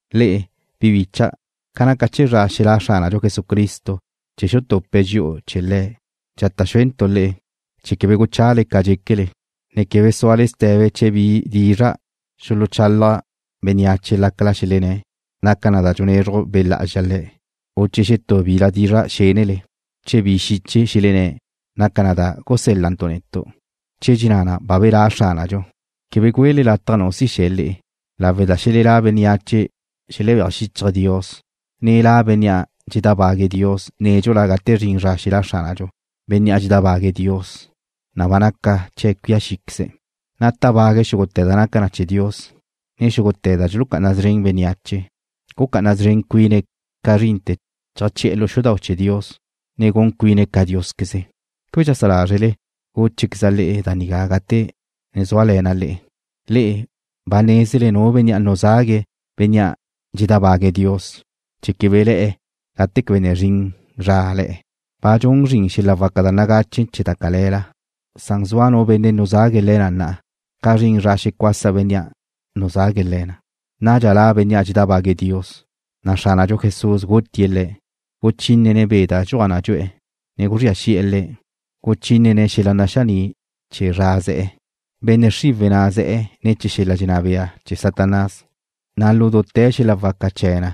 Le'e, bi bicha', ca naca chee̱ zra xelá' Xránadxu Jesucristo chee̱ xutupe̱' dxi'u chee̱ Le̱', dxata' xúentu' le'e chee̱ quebe guchale ca dxéquele, ne quebe súale ste̱be chee̱ bi dizra' xuluchalaj bénneache lácala xelenné̱' naca na da dxunezruj Be' Lá'azxa le̱', u chee̱ xetú bila dizra' xénele, u chee̱ bi xiche xelenné̱' naca na da gusél-lantu' netu', che dxenná na ba belá' Xránadxu. Quebe güele lataj nu si xe̱ le'e, lawe' da xelelá' bénneache xelebéaj xíchaje̱' Dios, ne la' bénnea' dxedábague̱' Dios nédxula gate zrin zra xelá' Xránadxu. Bénnea' dxedábague̱' Dios, na' ba naca chee̱' cuía xíqueze̱', na' tábague̱' xúgute̱ da naca chee̱ Dios, ne xúgute̱ da dxulucá'ana szren bénneache. Gucá'ana szren cuine̱' ca zrinte̱ cheajché'e̱ lu xudau' chee̱ Dios, ne gun cuine̱' ca Diósqueze. ¿Quebe dxeajsá lázrele gúchequeza' le'e da nigá gate na' zúale̱na' le'e? Le'e ba nézele Nu Benne' nuzague̱' bénnea' dxedábague̱' Dios chee̱ quebe le̱'e̱ gate quebe ne zrin zra le̱'e̱. Ba dxun zrin xel-la waca da nagache chee̱ da cale̱la, san zua Nu Benne' nuzague̱' le̱ na na'a, ca zrin zra xecuasa Bénnea' nuzague̱' le̱ na. Nadxa la' bénnea' dxedábague̱' Dios, na' Xránadxu Jesús gutie̱' le̱', guchínene̱' be' da dxuaj na dxu'e̱, ne guzría xi'e̱ le̱', guchínene̱' xel-la naxaní' chee̱ zra ze̱'e̱. Benne' xriwe̱' na' ze̱'e̱ ne̱ chee̱ xel-la dxenná bea chee̱ Satanás, na' lu dute̱ xel-la waca chee̱ na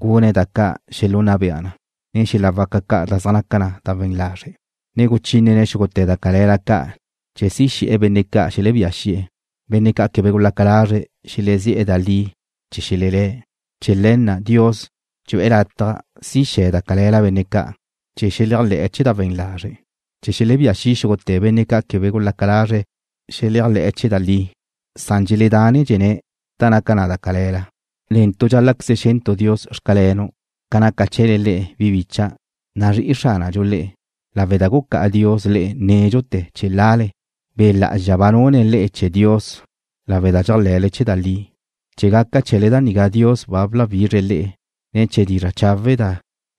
gune̱' da ca' xelunna bea na, ne xel-la waca ca' da zaj naca na we̱n lazre', ne guchínene̱' xúgute̱ da cale̱la ca' chee̱ si xe̱'e̱ benne' ca' xelebía xi'e̱, benne' ca' quebe gulaca lazre̱' xelezí'e̱ da li chee̱ xelelé̱'. Chee̱ le̱ na' Dios dxu'e̱ lataj si xe̱ da cale̱la benne' ca' chee̱ xeléajle̱'e̱ chee̱ da we̱n lazre', chee̱ xelebía xi' xúgute̱ benne' ca' quebe gulaca lazre̱' xeléajle̱'e̱ chee̱ da li, san dxeledánedxene̱' da naca da cale̱la. Netu' tu dxál-la'queze xe̱ntu' Dios: Xcalenu' ca naca chee̱le le'e, bi bícha'dau', nazrí'i Xránadxu le'e, lawe' da gucá'a Dios le'e nédxute̱ chee̱ lale. Be' Lá'azxa ba nune̱' le'e chee̱ Dios lawe' da dxéajle̱le chee̱ da li. Chee̱ gaca chee̱le da nigá Dios ba bláwizre̱' le'e ne̱ chee̱ dizra' chawe' da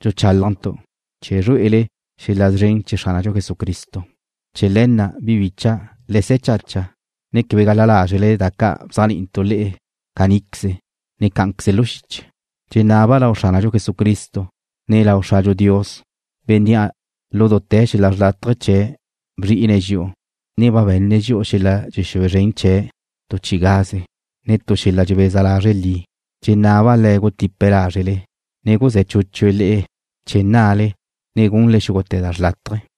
dxuchálajntu', chee̱ zrué'ele xel-la szren chee̱ Xránadxu Jesucristo. Chee̱ le̱ na', bi bícha'dau', le se̱ chacha, ne quebe gal-la lázrele da ca' bzéajni'intu' le'e caníqueze, ne cá'anqueze lu xiche. Dxenaba' lau Xránadxu Jesucristo, ne lau Xradxu Dios, Bénnea' lu dute̱ xel-la xrlátaje chee̱' bzri'ine̱' dxi'u, ne ba be̱nne̱' dxi'u xel-la dxexúe zren chee̱' tu chi'i gaze, ne tu xel-la dxebeza lazre' li. Dxenaba' Le̱' gutipe̱' lázrele, ne guzé̱ chúchue̱' le'e chee̱ nnale, ne gunle xúgute̱ da xrlátaje.